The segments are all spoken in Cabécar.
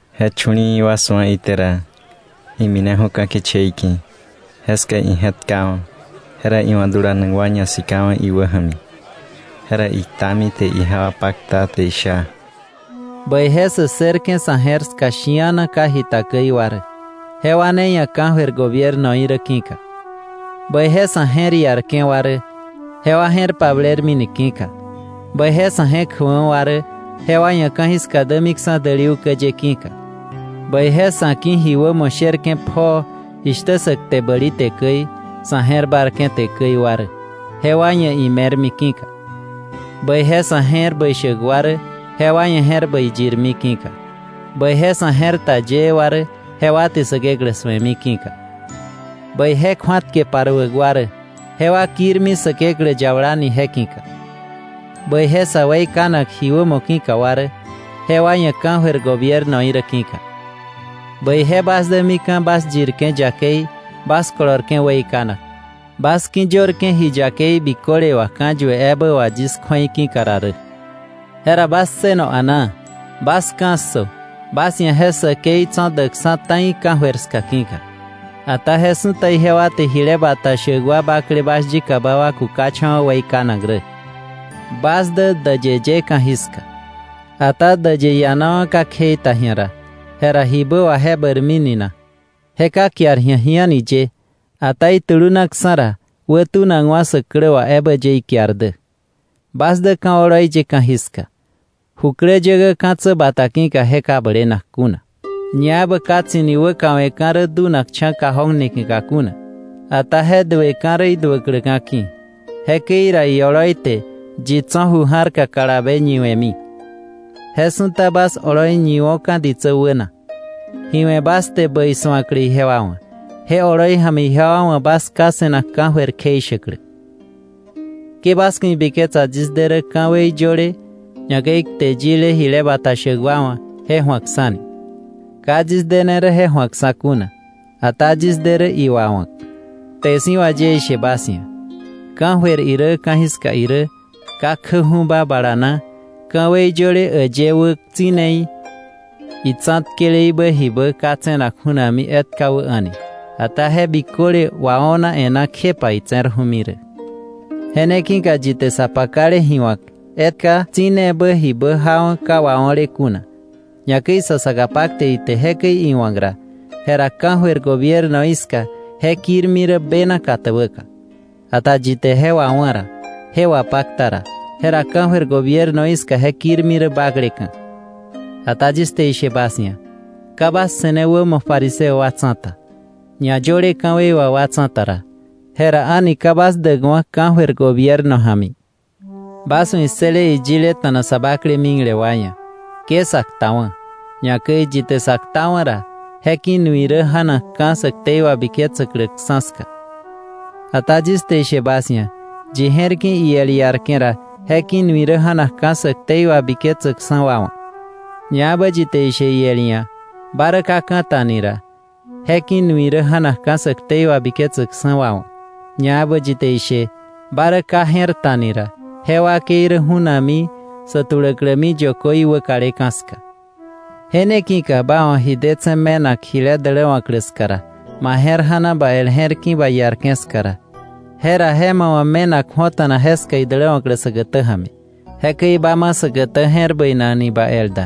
Je chu̱li̱i̱ wa su̱a ite ra, imineju̱ ka̱ kichei ki̱. Jeska ije̱tkawa̱, jera iwa̱ dulanak wa ñasikawa̱ iwäja̱mi. Jera iktami te ijewa pakta, te isha: “Bäije sä ssërke̱ sa̱ je̱r ska shi̱ana ka jita käi wa rä, jewa ne ia̱ ka̱jöir gobiernoí rä ki̱ka. “Bäije sa̱ je̱r iarke̱ wa rä, jewa je̱r pablermi ni ki̱ka. “Bäije sa̱ je̱k jäkwa̱ wa rä, jewa ia̱ ka̱jiska dämiksa̱ däli ukä ye ki̱ka. “Bäije sa̱ ki̱ ji wämo sherke̱ pjoo jishtä sä kte bäli te käi, sa̱ je̱r bárke̱ te käi wa rä, jewa ia̱ ime̱rmi ki̱ka. “Bäije sa̱ je̱r bäi shäk wa rä, jewa ia̱ je̱r bäi yirmi ki̱ka. “Bäije sa̱ je̱r ta yëë wa rä, jewa te Säkeklä su̱emi ki̱ka. “Bäije kju̱atke paruäk wa rä, jewa kirmi Säkeklä yabala ni je ki̱ka. “Bäije sä weikanak ji wämo ki̱ka wa rä, jewa ia̱ ka̱jöir gobiernoí rä ki̱ka. Bäije bas dä mika̱ bas yirke̱ yakei, bas kolorke̱ weikanak, bas ki̱yörke̱ ji yakei biköle wà ka̱yue ebä wà yis kju̱ei ki̱ka ra rä. Jera bas ssëno a̱naa, bas ka̱ssö, bas ia̱ je säkei tso̱ däksa̱ ta̱i ka̱jöir ska ki̱ka. Ata je su̱ta ijewa te jile bata shäk wa bakle bas yikaba wa kukacha̱wa̱ weikanak rä. “Bas dä däyë ye ka̱jiska. Ata däyë iianawa̱ ka kjei ta ji̱a ra, jera ¿jibä wà je bäirmini na? Je ka kiar ji̱a ji a̱ni ye, ata itulunaksa̱ ra wätunakwa̱ sä klä wà ebä ye ikiar dä. “Bas dä ka̱ oloi ye ka̱jiska. Jukläyäkä ka̱tsä bata ki̱ka ka je blenak kuna. Ñaebä ka tsi̱ni wäkawe̱ rä dunakcha̱ cajón niki̱ka kuna, ata je dueka̱ rä iduäkläka̱ ki̱, jekäi ra ioloi te yi tso̱ ju ja̱rka kalabe ñiwe̱mi. Je su̱ta bas oloi ñiwo̱ka̱ ditsä wäna, ji we̱ bas te bäi su̱aklä ijewa wa̱, je oloi ja̱mi ijewa wa̱ bas Ká se̱nak ka̱jöir kjeishäklä. “Ke bas ku̱ ibiketsa yis de rä ka̱wei yöle, ñakäi kte yile jile bata shäk wa wa̱, je ju̱akksa̱ ni. Ka yis dene rä je ju̱akksa̱ kuna, ata yis de rä iwawa̱k. Kte si̱ wà yis te ishe bas ia̱, ka̱jöir irä ka̱jiska irä ka kjäju̱ba bala na ka̱wei yöle äyë wä tsi̱neí, itsa̱tkeleíbä jibä ka tse̱nak ju̱nakmi etka wä a̱ni, ata je biköle wao̱na e̱ná kjepa itse̱rju̱mi rä. Je ne ki̱ka yi te sa pakale ji wa̱k etka tsi̱nebä jibä jawa̱ ka wao̱le kuna, ñakäi sa saka pakte ite jekäi iwa̱k ra, jera ka̱jöir gobiernoí ska je kirmi rä bena katäbäka. Ata yi te je wawá̱ ra, je wapakta ra, jera ka̱jöir gobiernoí ska je kirmi rä bakleka̱. Ata yis te ishe bas ia̱, ka bas se̱ne wämo fariseo wa tsa̱ta, ñayöle ka̱wei wà wa tsa̱ta ra, jera a̱ni ka bas däkwa̱ ka̱jöir gobierno ja̱mi. “Bas wa̱ issële iyileta̱na sa bakle mikle wa ia̱: ‘Ke sa ktawa̱,’ ñakäi: “Yi te sa ktawa̱ ra, je ki̱ nui rä ja̱nakka̱ sä ktei wabiketsäkläksa̱ ska. Ata yis te ishe bas ia̱, yi je̱r ki̱ iel iarke̱ ra, je ki̱ nui rä ja̱nakka̱ sä ktei wabiketsäkksa̱ wa wa̱; ñaebä yi te ishe iel ia̱: ‘Ba rä ka ka̱ta’ ni ra, je ki̱ nui rä ja̱nakka̱ sä ktei wabiketsäkksa̱ wa wa̱; ñaebä yi te ishe: ‘Ba rä ka je̱r ta’ ni ra, je wakei rä ju̱nakmi sä tuläklämi yökö í wäkaleka̱ ska. “Je ne ki̱ka ba wa̱ ji detse̱ me̱nak jile däläwa̱klä ska ra, ma je̱r ja̱na ba el je̱r ki̱ ba iarke̱ ska ra, jera je ma wa̱ me̱nak ju̱ota̱na jeska idäläwa̱klä säkätä ja̱mi, jekäi ba ma säkätä je̱r bäinak ni ba el da,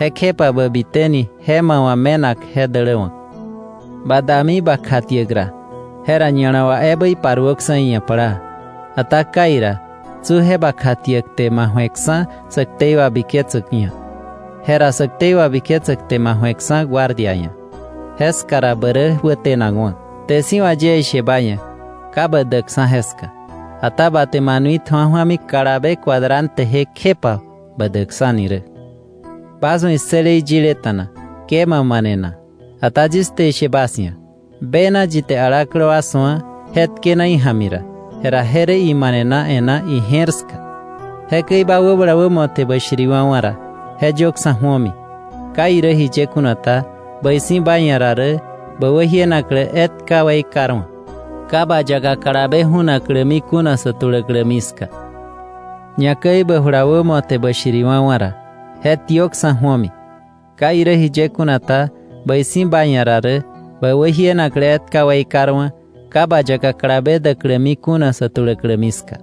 jekjepa bä bitä ni je ma wa̱ me̱nak je däläwa̱k. “Ba dami ba kjatiäk ra, jera ña̱la wà ebä iparuöksa̱ iia̱ plaa, ata kai ra, tsi je ba kjatiäk te ma ju̱eksa̱ sä ktei wabiketsäk ia̱, jera sä ktei wabiketsäk te ma ju̱eksa̱ guardia ia̱, jeska ra bä rä wätenakwa̱. Kte siwa̱ yie ishe ba ia̱, ka bä däkksa̱ jeska, ata ba te ma nui tju̱a ju̱ami kalabe cuadranteje kjepa bä dämiksa̱ni rä. “Bas wa̱ issële iyileta̱na: ‘Ke ma manena.’ Ata yis te ishe bas ia̱; bena yi te alaklä wa su̱a je tkena ija̱mi ra, jera je rä imanena e̱ná ira ije̱r ska. “Jekäi ba wäbala wämo te bä shiriwa̱wa̱ ra, je yöksa̱ ju̱omi. Ka irä jiye kuna ta, bäi si̱ ba ia̱ ra rä bä wäjienaklä etka weikarwa̱, ka ba yaka kalabe ju̱naklämi kuna sä tuläklämi ska. Ñakäi bä jula wämo te bä shiriwa̱wa̱ ra, je tiökksa̱ ju̱omi. Ka irä jiye kuna ta, bäi si̱ ba ia̱ ra rä bä wäjienaklä etka weikarwa̱ ka ba yaka kalabe däklämi kuna sä tuläklämi ska.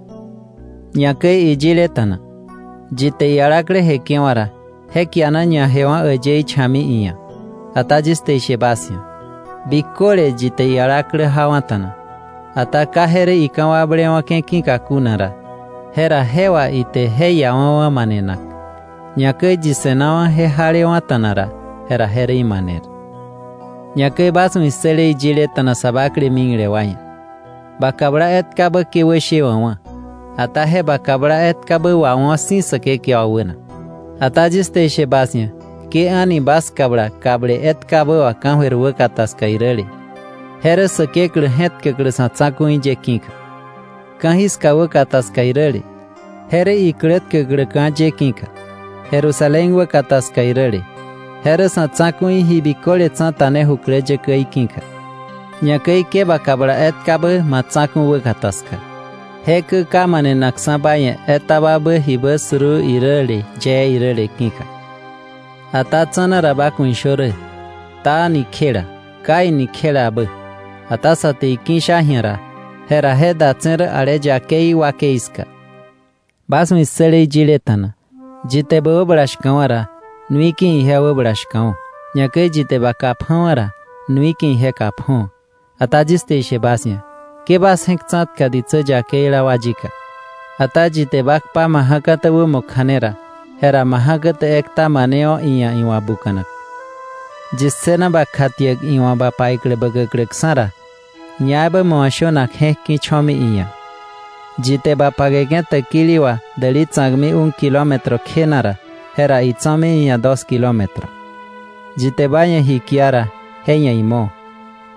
“Ñakäi iyileta̱na: ‘Yi te ialaklä jeke̱wa̱ ra, je kiana ñajewa̱ äyëí cha̱kmi iia̱.’ Ata yis te ishe bas ia̱: Biköle yi te ialaklä jawa̱ta̱na, ata ka je rä ika̱wakblewa̱ke̱ ki̱ka kuna ra, jera je wà ite je iawa̱wa̱ manenak. Ñakäi yi se̱nawa̱ je jalewa̱ta̱na ra, jera je rä imaner. “Ñakäi bas wa̱ issële iyileta̱na sa bakle mikle wa ia̱: ‘Ba kabla etkabä ke wäshewa̱kwa̱, ata je ba kabla etkabä wawo̱ si̱ Säkekewa wäna.’ Ata yis te ishe bas ia̱, ke a̱ni bas kabla kable etkabä wà ka̱jöir wäkata ska iräle, je rä Säkeklä je̱tkäklä sa̱ tsa̱ku̱i ye ki̱ka; ka̱jiska wäkata ska iräle, je rä iklä tkäkläka̱ ye ki̱ka; Jerusalén wäkata ska iräle, je rä Sa̱ Tsa̱ku̱i Ji Biköle Tsa̱ta ne jukläyäkäí ki̱ka. Ñakäi ke ba kabla etkabä ma tsa̱ku̱ wäkata ska, je kä ka manenakksa̱ ba ia̱ etababä jibä suruu iräle yee iräle ki̱ka. Ata tsa̱na ra bas ku̱ ishö rä: “Ta” ni kjela, “Kai” ni kjelabä; ata sa te iki̱ sha ji̱a ra, jera je datse̱ rä ale yakei wakei ska. “Bas wa̱ issële iyileta̱na: ‘Yi te bä wäbala shka̱wa̱ ra, nui ki̱ ije wäbala shka̱wo̱, ñaebä yi te ba kà pja̱wa̱ ra, nui ki̱ ije kà pjo̱wa̱.’ Ata yis te ishe bas ia̱: Ke bas je̱k tsa̱tka sä yakeila wa yika; ata yi te ba kpa ma ja̱kätä wämo kja̱ne ra, jera ma ja̱kätä ekta manewo̱ iia̱ iwa̱ buka̱nak. Yi ssëna ba kjatiäk iwa̱ ba paiklä bäkäkläksa̱ ra, ñakäi ma wa̱ shönak je̱k ki̱ cho̱mi iia̱. Yi te ba pakeke̱ täkili wà däli tsa̱kmi un kilómetro kjena ra, jera itso̱mi iia̱ dos kilómetro. Yi te ba ia̱ ji kia ra, je ia̱ imo;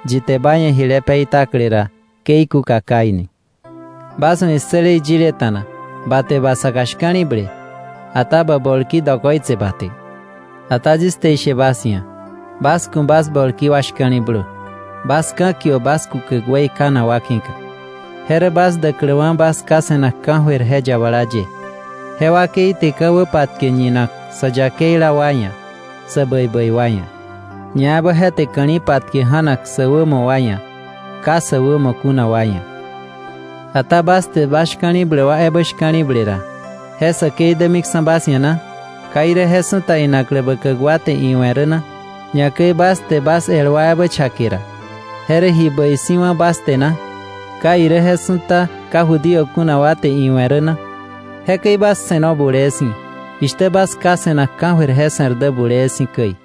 yi te ba ia̱ jile peitakle ra, ke ikúka kai ni. “Bas wa̱ issële iyileta̱na: ‘Ba te ba saka shka̱li̱ble, ata bä bolki dokoitse ba te.’ Ata yis te ishe bas ia̱: Bas ku̱ bas bolki wa shka̱li̱blö, bas ka̱kiö bas kukäk weikanak wa ki̱ka. Je rä bas däkläwa̱ bas Ká se̱nak ka̱jöir je yabala ye. Je wakei te ka̱wä patke ñinak sä yakeila wa ia̱, sä bäi bäi wa ia̱, ñaebä je te ka̱li̱ patke ja̱nak sä wämo wa ia̱, ka sä wämo kuna wa ia̱. Ata bas te bas shka̱li̱bläk wa ebä shka̱li̱ble ra, ¿je säkei dämiksa̱ bas ia̱ na? ¿Ka irä je su̱ta inaklä bäkäk wa te iwe̱ rä na? Ñakäi bas te bas el wa ebä chake ra, ¿je rä ji bäi si̱ wá̱ bas te na? ¿Ka irä je su̱ta ka Judío kuna wa te iwe̱ rä na? Jekäi bas se̱no bulee si̱, jishtä bas Ká se̱nak ka̱jöir je se̱r dä bulee si̱ käi.